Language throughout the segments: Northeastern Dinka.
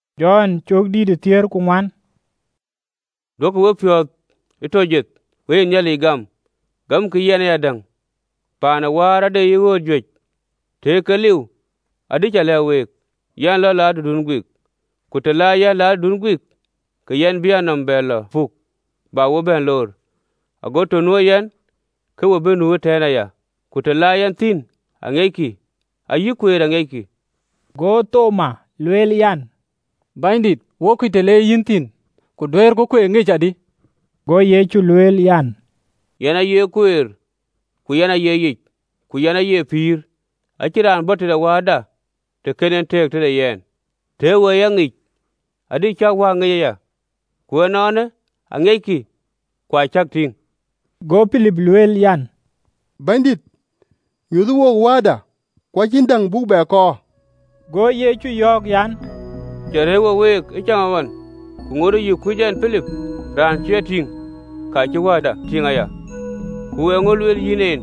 Go Yecu lɛ̈k keek an, “Duökï wepiɔ̈ɔ̈th tɔ jeth, we ye Nhialic gam, gamkï yɛn ayadäŋ. Paan ë Wäär ade yic ɣööt juëc: tëë ke liu, adï cä lɛ̈k week. Yɛn lɔ la tëdun guik. Ku të la yɛn, la tëdun guik, ke yɛn bï a nɔm bɛ lɔ puk, bä we bɛ̈n loor, ago të nuö yɛn, ke we bï nu ëtɛ̈ɛ̈n aya. Ku të la yɛn thïn aŋiɛckï, ayï kueer aŋiɛckï.” Go Thimon lueel an, “Bɛ̈nydït, wo kuc të le yïn thïn, ku duëërku kueer ŋic adï?” Go Yecu lueel an, “Yɛn aye kueer, ku yɛn aye yic, ku yɛn aye pïïr: acïn raan bɔ̈ tëde Wääda, të kën en tëëk tëde yɛn. Tëë we e ya ŋic, adï cäk Wääda ŋic aya: ku ënɔɔnë aŋiɛckï, ku acäk tïŋ.” Go Pilip lueel an, “Bɛ̈nydït, nyuöthë wook Wääda, ku acïn däŋ buk bɛ kɔɔr.” Go Yecu yɔ̈ɔ̈k an, “Cä rëër wo week ë caŋɣɔn, ku ŋuɔɔtë ke yï kuc ɛn, Pilip? Raan cï a tïŋ, ka cï Wääda tïŋ aya, ku eeŋö lueel yïn en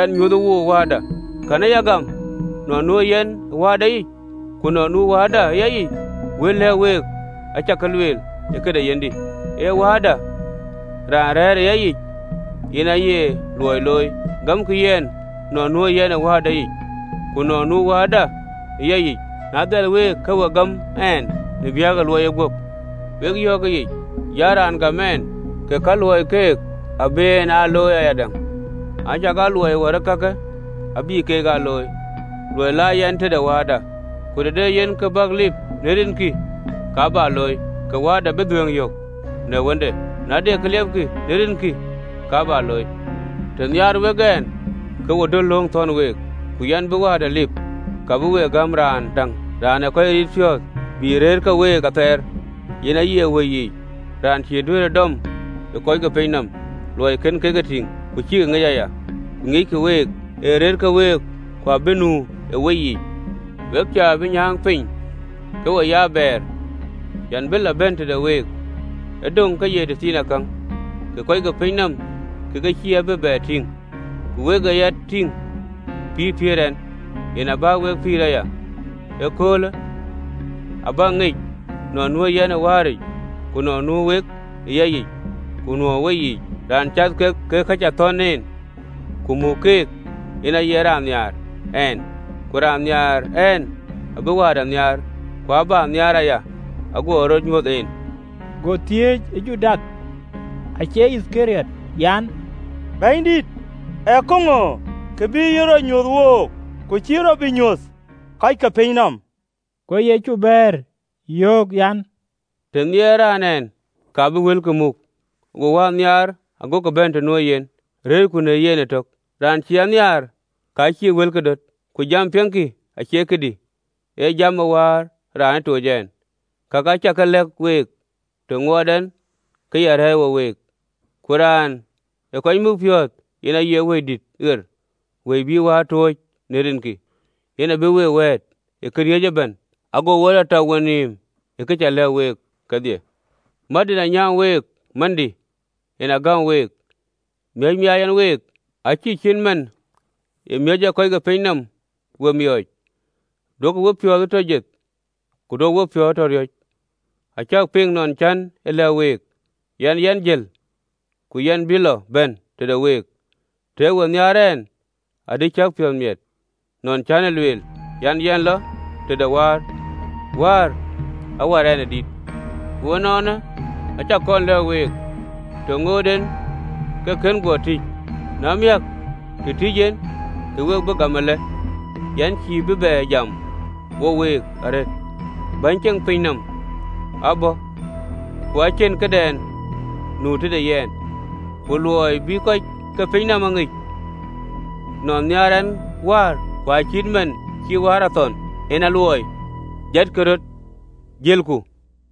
an, ‘Nyuöthë wook Wääda?’ Kɛ̈në ya gam nɔn nuö yɛn ë wääda yic, ku nɔn nu Wääda ë yayic? Wël lɛ̈k week, acä ke ye lueel ë këde yenhdï, ee Wääda raan rɛ̈ɛ̈r ë yayic yen aye luɔi looi. Gamkï yɛn nɔn nuö yɛn ë Wääda yic, ku nɔn nu Wääda ëya yic: na dhɛl week, ke we gam ɛn në biäk de luɔiyë guöp. Wek yɔ̈ɔ̈k ëyic an: Raan gam ɛn, ke ka luɔɔi abï keek aa looi ayadäŋ, acakaa luɔi wär ee kakë abï keek aa looi, luɔi la yɛn tëde Wääda. Ku të de yen kë bäk lip në rinkï, ka bä looi, ke Wääda bï dhuëëŋ yök në Wënde. Na de kë liɛpkï në rinkï, ka bä looi. Të nhiaar wek ɛn, ke we döt lööŋ thɔ̈n week. Ku yɛn bï Wääda lip, ka bï we gäm Raan däŋ Raan ee kɔc riit piɔ̈ɔ̈th, bï aa rëër ke week athɛɛr, yen aye Wëi yic: Raan cï duëërë dɔm ë kɔc ke piny nɔm, luɔi kën kek e tïŋ, ku cïkï ŋic aya: ku ŋiɛckï week, ee rëër ke week, ku abï nu ë weyiic. “We cä bï nyääŋ piny ke we ye abɛɛr: yɛn bï lɔ bɛ̈n tëde week. Ë döŋ ke ye tëthiinakäŋ, ke kɔc ke piny nɔm ke ke cïï a bï bɛ tïŋ: ku wek ee ya tïŋ: pïïr piëër ɛn, yen abä wek pïïr aya. Ëköölë abäk ŋic nɔn nuö yɛn ë wääric, ku nɔn nuö wek ë yayic, ku nuö ë weyiic. “Raan gam lööŋ cï ke thɔ̈n ɛn, ku muk keek, yen aye raan nhiaar ɛn: ku raan nhiaar ɛn abïï Wäär nhiaar, ku abä nhiaar aya, aguɔ rɔt nyuöth en.” Go thiëëc ë Judath (acie Yithkariɔt) an, “Bɛ̈nydït, ee kaŋö kë bï yïn rɔt nyuöth wook, ku cïï rɔt bï nyuöth kɔc ke piny nɔm?” Go Yecu bɛ̈ɛ̈r, yöök an, “Të nhiɛɛrë raan ɛn, ka bï wëlkï muk: go Wäär nhiaar, agoku bɛ̈n të nu yen, rëërku në yen ëtök. Raan cïï a nhiaar, ka cïï wëlkï ee döt: ku jam piɛŋkï acie këdï, ee jam ë Wäär raan ë toc ɛn. Kakë acä ke lɛ̈k week, të ŋuɔɔt ɛn ke ya rɛ̈ɛ̈r wo week. Ku Raan ee kɔc muk piɔ̈ɔ̈th, yen aye Wëidït ɣer, Wëi bïï Wäär tooc në rinkï, yen abï we wɛ̈ɛ̈t ë këriëëc ëbɛ̈n, ago we tɔ tak wenïïm ë ka cä lɛ̈k week kedhie. “Mät en anyäŋ week, mändï en agäm week: miɔ̈c miaac ɛn week, acïï cït man ë miɔ̈c ee kɔc ke piny nɔm we miɔɔc. Duökï wepiɔ̈ɔ̈th tɔ jeth, ku duökï wepiɔ̈ɔ̈th tɔ riɔ̈c. Acäk piŋ nɔn cän e lɛ̈k week an, ‘Yɛn jël, ku yɛn bï lɔ bɛ̈n tëde week.’ Tëë we nhiaar ɛn, adï cäk piɔ̈ɔ̈th miɛt, nɔn cän e lueel an, ‘Yɛn lɔ tëde Wäär.’ Wäär awär ɛn e dït. Ku ënɔɔnë, acä kɔn lɛ̈k week të ŋoot en ke kën guɔ tïc, na miäk, të tïc en, ke we bï gam. Ëlë, yɛn cïï bï bɛ jam wo week arëët: bɛ̈ny ceŋ pinyë nɔm abɔ̈, ku acïn këdɛn nu tëde yɛn, ku luɔi bï kɔc ke piny nɔm e ŋic nɔn nhiaar ɛn wäär, ku acït man cï Wäär a thɔn, en aluɔɔi. “Jatkï röt, jëlku eenë.